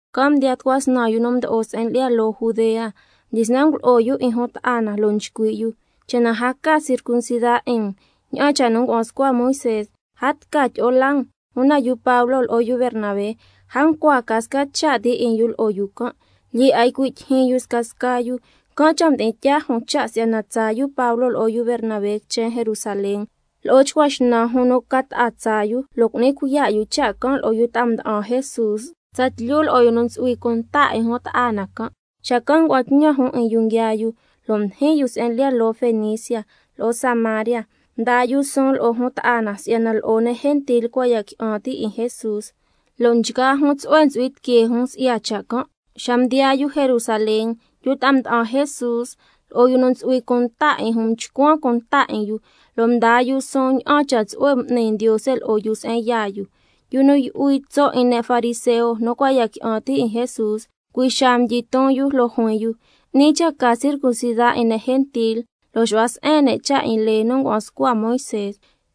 Can' mdiyaa tucua snan yu nu mdo'o se'en lyi'ya loo Judea, mdyisnan ngulo'o yu 'in jun ta'a na, lo' nchcui' yu: Cha' na a ca circuncida 'in um ña'an cha' nu ngua'an scua Moisé, a tca tyi'o laa um. Una yu Pablo lo'o yu Bernabé a ncua ca sca cha' ti 'in yu lo'o yu can', lyee 'a ycui' tyijyin yu scasca yu, can' cha' mdi'in tyaa jun cha' si'yana tsaa yu Pablo lo'o yu Bernabé quichen Jerusalén, lo'o chcua xnan jun nu ca ta'a tsaa yu, lo' cu'ni cuiya' yu cha' can' lo'o yu ta'a mda'an Jesús, tsatlyu lo'o yu nu ntsu'hui cunta 'in jun ta'a na can'. Xacan' ngua'an tñan jun 'in yu nguiaa yu, lo' mdijin yu se'en lyi'ya loo Fenicia lo'o Samaria, mdaa yu suun lo'o jun ta'a na si'yana lo'o ne' gentil cua' ya qui'an ti' 'in Jesús, lo' nchgaa jun tsu'hue ntsu'hui tiquee jun si'ya cha' can'. Xa mdiyaa yu Jerusalén, yu ta'a mda'an Jesús lo'o yu nu ntsu'hui cunta 'in jun mchcuan cunta 'in yu, lo' mdyisnan mdaa yu suun ña'an cha' tsu'hue m'ni Ndiose lo'o yu se'en yaa yu. Yu nu yu'hui tso' 'in ne' fariseo nu cua' ya qui'an ti' 'in Jesús, cui' xaa mdyiton yu, lo' juin yu: 'Ni cha' ca circuncida 'in ne' gentil lo' xu'hua se'en ne' cha' 'in lee nu ngua'an scua Moisé.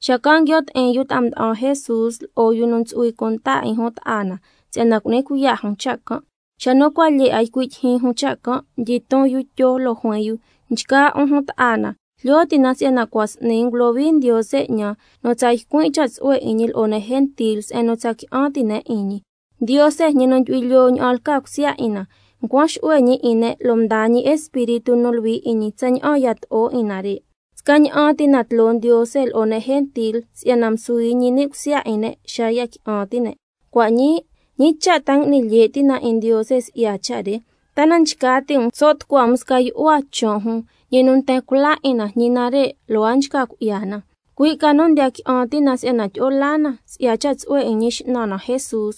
Xacan' nguio' ti'in yu ta'a mda'an Jesús lo'o yu nu ntsu'hui cunta 'in jun ta'a na, si'yana cu'ni cuiya' jun cha' can'. Xa nu cua' lyee 'a ycui' tyijyin jun cha' can', mdyiton yu Tyo lo' juin yu: Nchgaa 'un jun ta'a na, jlyo ti' na si'yana cua' s'ni ngulohui Ndiose 'ñan nu tsa ycuin' cha' tsu'hue 'in ñi lo'o ne' gentil se'en nu tsa qui'an ti' ne' 'in ñi. Ndiose, ñi nu ndyu'hui lyoo ña'an lca cusya 'in na, ncuan xu'hue ñi 'in ne' lo' mdaa ñi Espíritu nu Luhui 'in ñi tsaña'an yato'o 'in nare'. Scaña'an ti na tloo Ndiose lo'o ne' gentil, si'yana msuhui ñi ni' cusya 'in ne' xa nu ya qui'an ti' ne'. Cua' ñii, ¿ñi cha' ta ngui'ni lye' ti' um 'in Ndiose si'ya cha' re? ¿Ta na nchca ti' um so' tucua um sca yu'hua chon' jun nu cua' ntsu'hui cha' 'in Jesús, sca yu'hua nu ñi nten cula 'in na, ñi nare', lo' a nchca cui'ya na? Cui' ca nu ndiya qui'an ti' na si'yana tyi'o laa na si'ya cha' tsu'hue 'in Ñi X'nan na Jesús,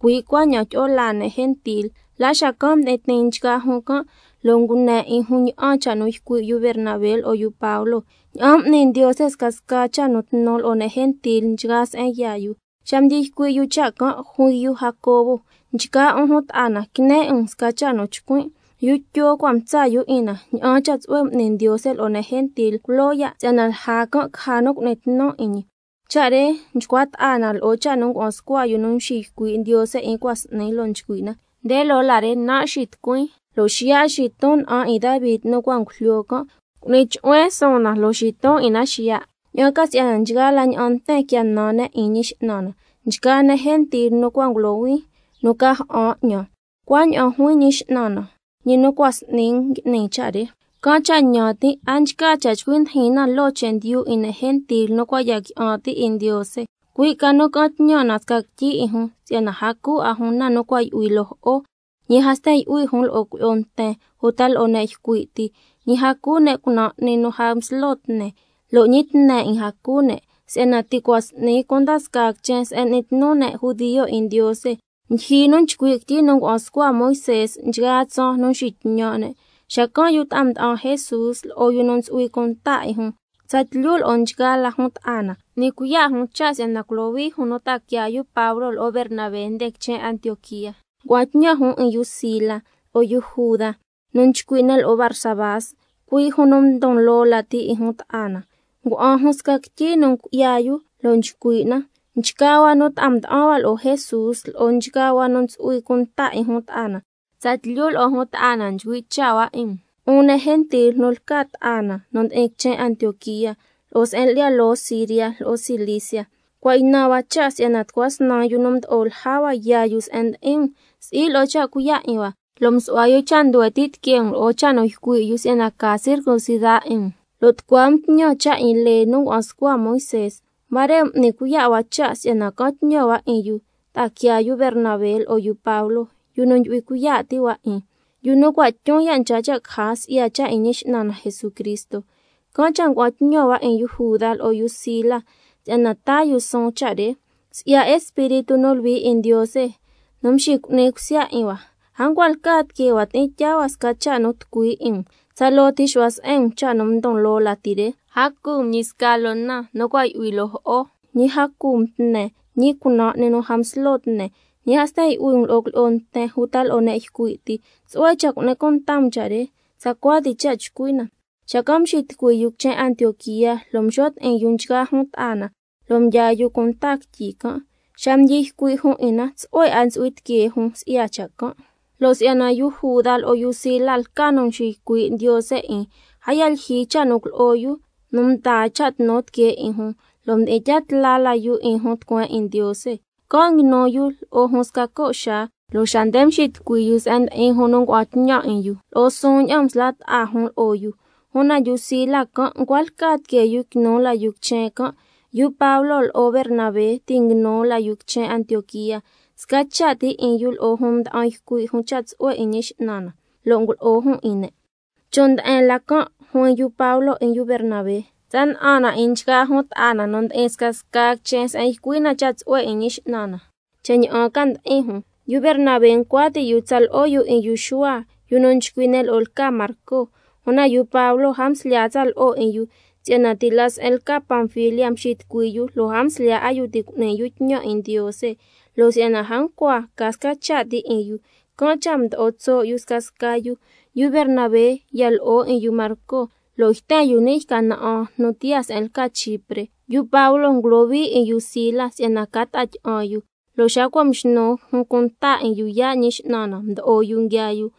cui' cuaña'an tyi'o laa ne' gentil. La xacan' mdi'in tiin nchgaa jun can', lo' ngune 'in jun ña'an cha' nu ycui' yu Bernabé lo'o yu Pablo, ña'an m'ni Ndiose scasca cha' nu tnu lo'o ne' gentil nchgaa se'en yaa yu. Xa mdyi ycui' yu cha' can', juin yu Jacobo: Nchgaa 'un jun ta'a na, quine 'in um sca cha' nu chcuin': Yu Tyo cua' mtsa' yu 'in na ña'an cha' tsu'hue m'ni Ndiose lo'o ne' gentil culoo ya', si'yana lja can' caja nu cu'ni tnu 'in ñi. Cha' re nchcua ta'a na lo'o cha' nu ngua'an scua yu nu mxiycui' Ndiose 'in cua' s'ni, lo' nchcui' na: —Nde loo la re, nan' xitucuin, lo' xiya' xiton na'an 'in Davi nu cua' ngujlyo can', cu'ni chu'huen suun na, lo' xiton 'in na xiya', ña'an ca si'yana nchgaa la ña'an nten quia nan ne' 'in ñi X'nan na, nchgaa ne' gentil, tsalca nu cua' ngulohuin nu ca ja'an 'ñan. Cuaña'an juin Ñi X'nan na, ñi nu cua' s'ni ngui'ni cha' re—. Can' cha' ñan tin', a nchca cha' chcui ndijin na loo chendyu 'in ne' gentil nu cua' ya qui'an ti' 'in Ndiose. Cui' ca nu ca'an tñan na sca quityi 'in jun, si'yana a cu 'a jun na nu cua' yu'hui loo jo'o, ñi a sten yu'hui jun lo'o cuilyi'o nten uta lo'o ne' ycui' ti, ñi a cu ne' cunan' 'ni nu a nslo tne, ñi a ntsu'hui cha' cu ne' tne 'ni. Si'yana ti' cua' s'ni cunda scaa quichen se'en n'ni tnu ne' judio 'in Ndiose, ndyijyi nu nchcui' quityi nu ngua'an scua Moisé nchgaa tsaan nu nxitñan' na. Xacan' yu ta'a mda'an Jesús lo'o yu nu ntsu'hui cunta 'in jun, tsatlyu lo'o nchgaa la jun ta'a na, m'ni cuiya' jun cha' si'yana culohui jun nu ta'a quiaa yu Pablo lo'o Bernabé nde quichen Antioquía. Ngua'an tñan jun 'in yu Sila, lo'o Juda, nu nchcui' ne' lo'o Barsabás, cui' jun nu ndon loo lati 'in jun ta'a na. Ngua'an jun sca quityi nu cui'ya yu, lo' nchcui' na: Nchgaa hua nu ta'a mda'an hua lo'o Jesús, lo'o nchgaa hua nu ntsu'hui cunta 'in jun ta'a na, tsatlyu lo'o jun ta'a na nchcui' cha' hua 'in um, 'un ne' gentil nu lca ta'a na nu ndi'in quichen Antioquía, lo'o se'en lyi'ya loo Siria lo'o Cilicia. Cua' ynan hua cha' si'yana tucua snan yu nu mdo'o lja hua yaa yu se'en ndi'in um, si'i lo'o cha' cuiya' 'in hua, lo' msu'hua yu cha' nduhue ti' tiquee um lo'o cha' nu ycui' yu si'yana ca circuncida 'in um, lo' tucua um tñan cha' 'in lee nu ngua'an scua Moisé. Huare' m'ni cuiya' hua cha' si'yana ca'an tñan hua 'in yu nu ta'a quiaa yu Bernabé lo'o yu Pablo, yu nu ndyu'hui cuiya' ti' hua 'in, yu nu cua' tyun ya' nchca cha' caja si'ya cha' 'in Ñi X'nan na Jesucristo. Can' cha' ngua'an tñan hua 'in yu Juda lo'o yu Sila se'en ndi'in um si'yana tca taa yu suun cha' re. Si'ya Espíritu nu Luhui 'in Ndiose nu mxicu'ni cusya 'in hua, a ncua lca tiquee hua ti'in tyaa hua sca cha' nu tucui 'in um, tsaloo ti xu'hua se'en um cha' nu ndon loo lati re: A cu um ñi sca loo na nu cua' yu'hui loo jo'o, ñi a cu um tne, ñi cunan' 'ni nu a nslo tne, ñi a sten yu'hui um lo'o cuilyi'o nten uta lo'o ne' ycui' ti. Tsu'hue cha' cu'ni cunta um cha' re. Tsacua ti cha' chcui' na. Xacan' mxitucui yu quichen Antioquía, lo' mxo' ti'in yu nchgaa jun ta'a na, lo' mdyaa yu cunta quityi can'. Xa mdyi ycui' jun 'in na, tsu'hue 'a ntsu'hui tiquee jun si'ya cha' can'. Si'yana yu Juda lo'o yu Sila lca yu nu nxiycui' Ndiose 'in, a yaa lyijyi cha' nu ngulo'o yu nu taa cha' tnu tiquee 'in jun, lo' mdi'in tya tla la yu 'in jun tucueen 'in Ndiose. Can' nguinu yu lo'o jun sca co' xaa, lo' xa nde xitucui yu se'en ndi'in jun nu ngua'an tñan 'in yu, lo'o suun ña'an msla' ta'a jun lo'o yu. Una yu Sila can' ncua lca tiquee yu quinu la yu quichen can'. Yu Pablo lo'o Bernabé ti' nguinu la yu quichen Antioquía, sca cha' ti 'in yu lo'o jun mda'an ycui' jun cha' tsu'hue 'in Ñi X'nan na, lo' ngulo'o jun 'in ne'. Chon' nde'en la can' juin yu Pablo 'in yu Bernabé: Tsa na'an na 'in nchgaa jun ta'a na nu ndi'in scasca quichen se'en ycui' na cha' tsu'hue 'in Ñi X'nan na, cha' ña'an ca ndi'in jun. Yu Bernabé ncua ti' yu tsa lo'o yu 'in yu Xuhua, yu nu nchcui' ne' lo'o lca Marco. Una yu Pablo a mslyaa tsa lo'o 'in yu, si'yana ti' la se'en lca Panfilia mxitucui yu lo' a mslyaa 'a yu ti' cu'ni yu tñan 'in Ndiose. Lo' si'yana a ncua ca sca cha' ti 'in yu, can' cha' mdo'o tso' yu scasca yu. Yu Bernabé ya lo'o 'in yu Marco, lo' yten yu ni' sca yca na'an nu tiyaa se'en lca Chipre. Yu Pablo ngulohui 'in yu Sila si'yana ca ta'a tyi'an yu, lo' xa cua' mxnu jun cunta 'in yu yaa' Ñi X'nan na mdo'o yu nguiaa yu.